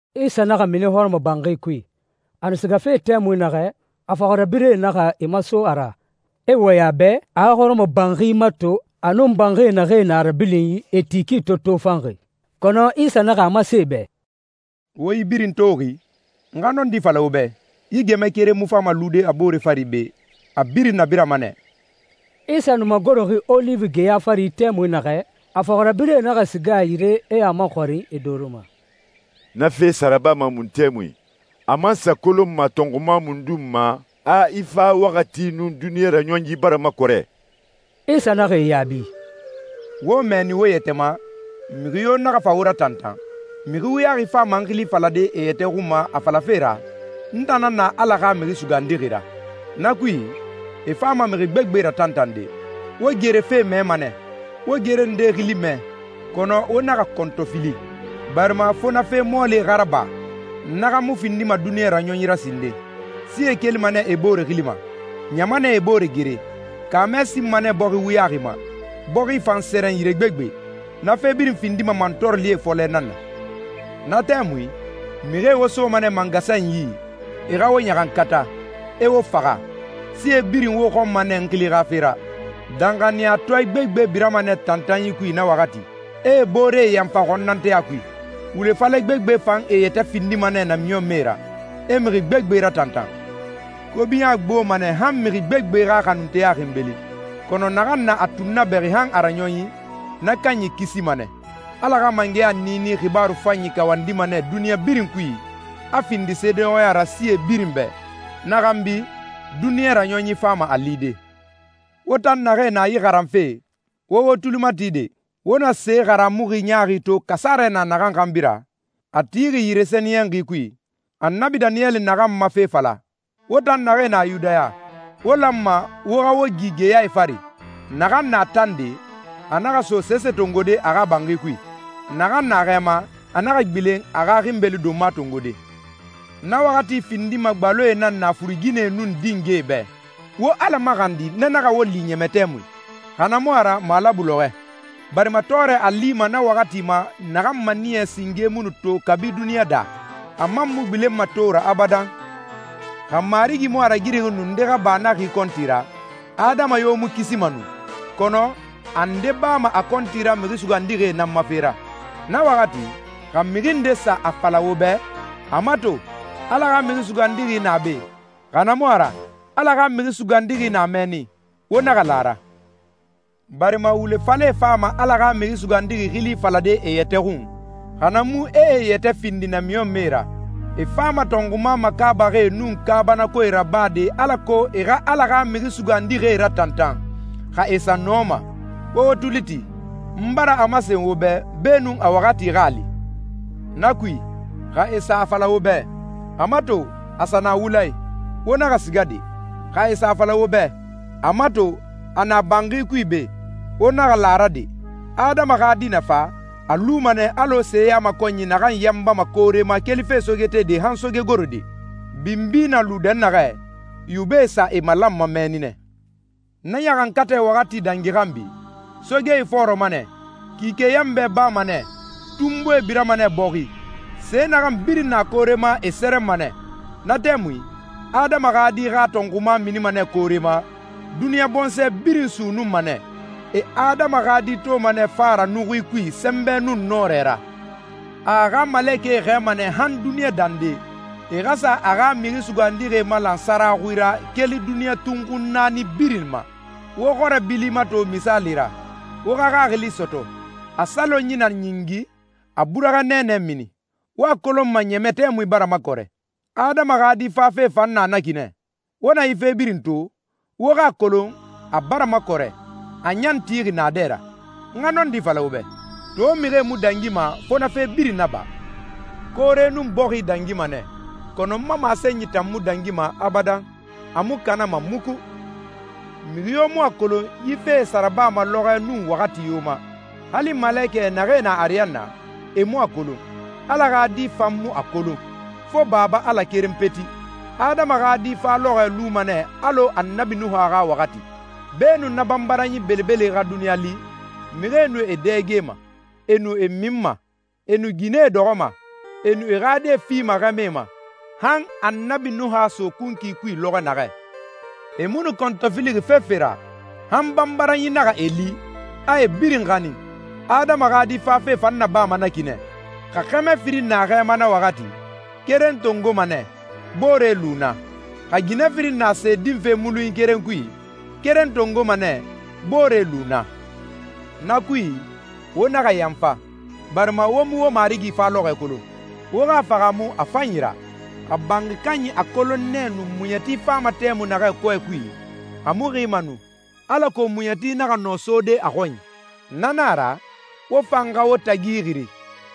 Isa naxa mini hɔrɔmɔbanxi kui. A nu sigafe tɛmui naxɛ, a fɔxirabirɛe naxa e maso a ra, e wɔyɛn a bɛ a xa hɔrɔmɔbanxi mato a nun banxie naxee na a rabilinyi, e ti ki to tofanxi. Kɔnɔ Isa naxa a masen e bɛ, «Wo yi birin toxi? N xa nɔndi fala wo bɛ, yi gɛmɛ keren mu fama lude a boore fari be, a birin nabirama nɛ.» Isa nu magoroxi Oliwi geya fari tɛmui naxɛ, a fɔxirabirɛe naxa siga a yire, e a maxɔrin e doro ma, «Na fe sa rabama mun tɛmui? A man sa kolonma tɔnxuma mundun ma a i fa waxati nun duniɲa raɲɔnyi bara makɔrɛ?» Isa naxa e yaabi, «Wo mɛnni wo yɛtɛ ma, mixi yo naxa fa wo ratantan. Mixi wuyaxi fama n xili falade e yɛtɛ xun ma a falafe ra, ‹N tan nan na Ala xa Mixi Sugandixi ra.› Na kui, e fama mixi gbegbe ratantande.» «Wo gere fe mɛma nɛ, wo gere ndee xili mɛ, kɔnɔ wo naxa kɔntɔfili, barima fo na fe mɔɔlie xa raba. Na xa mu findima duniɲa raɲɔnyi ra sinden. Sie kelima nɛ e boore xili ma, ɲamanɛe e boore gere. Kaamɛ sinma nɛ bɔxi wuyaxi ma, bɔxi fan sɛrɛn yire gbegbe. Na fe birin findima mantɔɔrɔlie fɔlɛ nan na.» «Na tɛmui, mixie wo soma nɛ mangasanyi yi, e xa wo ɲaxankata, e wo faxa. Sie birin wo xɔnma nɛ n xili xa fe ra. Danxaniyatɔɛ gbegbe birama nɛ tantanyi kui na waxati, e e booree yanfa xɔnnanteya kui. Wule falɛ gbegbe fan e yɛtɛ findima nɛ namiɲɔnmɛe ra, e mixi gbegbe ratantan. Kobiɲa gboma nɛ han mixi gbegbe xa xanunteya xinbeli, kɔnɔ naxan na a tunnabɛxi han a raɲɔnyi, na kanyi kisima nɛ. Ala xa mangɛya niini xibaaru fanyi kawandima nɛ duniɲa birin kui, a findi seedeɲɔxɔya ra sie birin bɛ. Na xanbi, duniɲa raɲɔnyi fama a lide.» «Wo tan naxee na yi xaranfe, wo wo tuli mati de! Wo na se haramuxi ɲaaxi to kasarɛ na naxan xanbi ra, a tixi yire sɛniyɛnxi kui, Annabi Daniyɛli naxan ma fe fala, wo tan naxee na Yudaya, wo lanma wo xa wo gi geyae fari. Naxan na tande, a naxa so sese tongode a xa banxi kui. Naxan na xɛ ma, a naxa gbilen a xa xinbeli donma tongode. Na waxati findima gbaloe nan na furuginɛe nun dingɛe bɛ! Wo Ala maxandi na naxa wo li ɲɛmɛ tɛmui, xa na mu a ra malabu lɔxɔɛ. Barima tɔɔrɛ a lima na waxati ma naxan maniyɛ singe mu nu to kabi duniɲa daa, a man mu gbilenma to ra abadan. Xa Marigi mu a ragirixi nu nde xa ba na xi kɔnti ra, adama yo mu kisima nu. Kɔnɔ a nde bama a kɔnti ra mixi sugandixie nan ma fe ra.» «Na waxati, xa mixi nde sa a fala wo bɛ, ‹A mato, Ala xa Mixi Sugandixi na be›, xa na mu a ra, ‹Ala xa Mixi Sugandixi na mɛnni›, wo naxa la a ra. Barima wule falɛe fama Ala xa Mixi Sugandixi xili falade e yɛtɛ xun, xa na mu e e yɛtɛ findi namiɲɔnmɛe ra. E fama tɔnxuma makaabaxie nun kaabanakoe rabade alako e xa Ala xa mixi sugandixie ratantan, xa e sa nɔma. Wo wo tuli ti, n bara a masen wo bɛ beenun a waxati xa a li.» «Na kui, xa e sa a fala wo bɛ, ‹A mato, a sa na wula i›, wo naxa siga de! Xa e sa a fala wo bɛ, ‹A mato, a na banxi kui be›, wo naxa la a ra de! Adama xa Di na fa, a luma nɛ alɔ seyamakɔnyi naxan yanbama koore ma kelife sogetede han sogegorode. ‹Binbi na lu dɛnnaxɛ, yubɛe sa e malanma mɛnni nɛ.›» «Na ɲaxankatɛ waxati dangi xanbi, ‹soge ifɔɔrɔma nɛ, kike yanbɛ bama nɛ, tunbuie birama nɛ bɔxi, se naxan birin na koore ma e sɛrɛnma nɛ.›» «Na tɛmui, Adama xa Di xa tɔnxuma minima nɛ koore ma. Duniɲa bɔnsɔɛ birin sunnunma nɛ. E Adama xa Di toma nɛ fa ra nuxui kui sɛnbɛ nun nɔrɛ ra. A a xa malekɛe xɛɛma nɛ han duniɲa dande, e xa sa a xa mixi sugandixie malan sara xui ra keli duniɲa tunxun naani birin ma.» «Wo xɔrɛ bili mato misaali ra, wo xa xaxili sɔtɔ. A salonyi na ɲingi, a burɛxɛ nɛɛnɛ mini, wo a kolonma ɲɛmɛ tɛmui bara makɔrɛ. Adama xa Di fafe fan na na ki nɛ. Wo na yi fe birin to, wo xa a kolon a a bara makɔrɛ, a ɲan tixi naadɛ ra. N xa nɔndi fala wo bɛ, to mixie mu dangima fo na fe birin naba. Koore nun bɔxi dangima nɛ, kɔnɔ n ma masenyi tan mu dangima abadan, a mu kanama muku.» «Mixi yo mu a kolon yi fee sa rabama lɔxɔɛ nun waxati yo ma. Hali malekɛ naxee na ariyanna, e mu a kolon, Ala xa Di fan mu a kolon, fo Baba Ala keren peti. Adama xa Di fa lɔxɔɛ luma nɛ alɔ Annabi Nuha xa waxati. Beenun na banbaranyi belebele xa duniɲa li, mixie nu e dɛgema, e nu e minma, e nu ginɛe dɔxɔma, e nu e xa die fima xɛmɛe ma, han Annabi Nuha so kunkui kui lɔxɔ naxɛ. E mu nu kɔntɔfilixi fefe ra, han banbaranyi naxa e li, a e birin xanin. Adama xa Di fafe fan nabama na ki nɛ. Xa xɛmɛ firin na xɛ ma na waxati, keren tongoma nɛ, boore lu naa. Xa ginɛ firin na se dinfe mulunyi keren kui, keren tongoma nɛ, boore lu naa. Na kui, wo naxa yanfa, barima wo mu wo Marigi fa lɔxɔɛ kolon. Wo xa a fahaamu a fanyi ra, xa banxi kanyi a kolon nɛ nu muɲɛti fama tɛmui naxɛ kɔɛ kui, a mu xima nu, alako muɲɛti naxa nɔ sode a xɔnyi. Na nan a ra, wo fan xa wo tagi ixiri,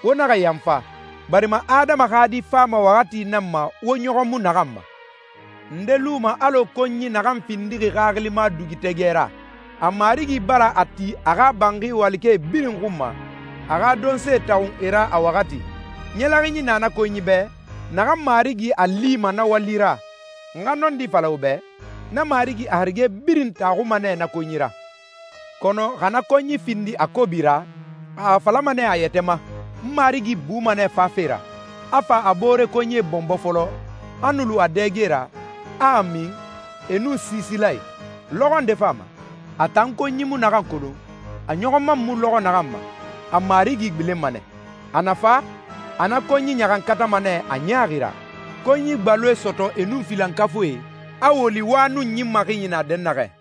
wo naxa yanfa, barima Adama xa Di fama waxati nan ma wo ɲɔxɔ mu naxan ma.» «Nde luma alɔ konyi naxan findixi xaxilima dugutɛgɛ ra? A marigi bara a ti a xa banxi walikɛe birin xun ma, a xa donsee taxun e ra a waxati. Ɲɛlɛxinyi na na konyi bɛ, naxan marigi a lima na wali ra. N xa nɔndi fala wo bɛ, na marigi a harige birin taxuma nɛ na konyi ra.» «Kɔnɔ xa na konyi findi a kobi ra, a a falama nɛ a yɛtɛ ma, ‹N marigi buma nɛ fafe ra,› a fa a boore konyie bɔnbɔ fɔlɔ, a nu lu a dɛge ra, a a min, e nun siisilae. Lɔxɔ nde fama, a tan konyi mu naxan kolon, a ɲɔxɔ man mu lɔxɔɛ naxan ma, a marigi gbilenma nɛ. A na fa, a na konyi ɲaxankatama nɛ a ɲaaxi ra, konyi gbaloe sɔtɔ e nun filankafuie, a woli wa nun ɲin maxinyi na dɛnnaxɛ.»